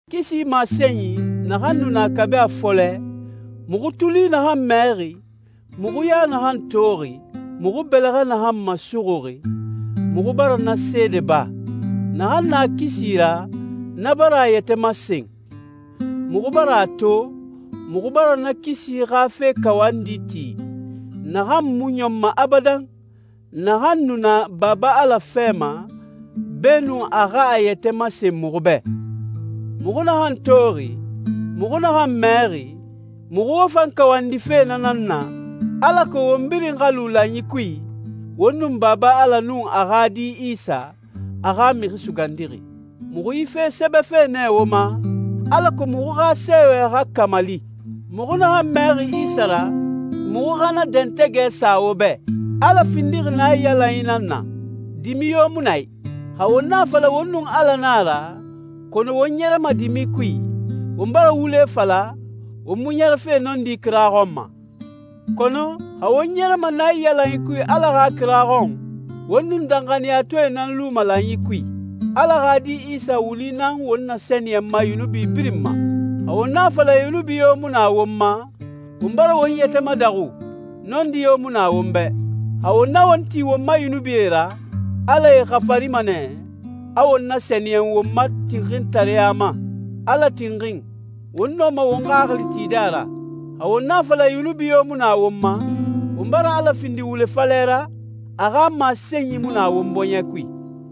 Kisi masenyi, naxan nu na kabi a fɔlɛ, muxu tuli naxan mɛxi, muxu ya naxan toxi, muxu bɛlɛxɛ naxan masuxuxi, muxu bara na seede ba. Naxan na kisi ra, na bara a yɛtɛ masen. Muxu bara a to, muxu bara na kisi xa fe kawandi ti, naxan mu ɲɔnma abadan, naxan nu na Baba Ala fɛ ma, beenun a xa a yɛtɛ masen muxu bɛ. Muxu naxan toxi, muxu naxan mɛxi, muxu wo fan kawandife na nan na, alako won birin xa lu lanyi kui, won nun Baba Ala nun a xa Di Isa, a xa Mixi Sugandixi. Muxu yi fe sɛbɛfe nɛ wo ma, alako muxu xa sɛɛwɛ xa kamali. Muxu naxan mɛxi Isa ra, muxu xa na dɛntɛgɛ sa wo bɛ. Ala findixi naiyalanyi nan na. Dimi yo mu na a i. Xa won a fala won nun Ala na a ra, kɔnɔ won ɲɛrɛma dimi kui, won bara wule fala, won mu ɲɛrɛfe nɔndi kira xɔn ma. Kɔnɔ, xa won ɲɛrɛma naiyalanyi kui Ala xa kira xɔn, won nun danxaniyatɔɛe nan luma lanyi kui. Ala xa Di Isa wuli nan won nasɛniyɛnma yunubi birin ma. Xa won a fala yunubi yo mu na won ma, won bara won yɛtɛ madaxu, nɔndi yo mu na won bɛ. Xa won na won ti won ma yunubie ra, Ala e xafarima nɛ, a won nasɛniyɛn won ma tinxintareya ma. Ala tinxin, won nɔma won xaxili tide a ra. Xa won a fala yunubi yo mu na won ma, won bara Ala findi wule falɛ ra, a xa masenyi mu na won bɔɲɛ kui.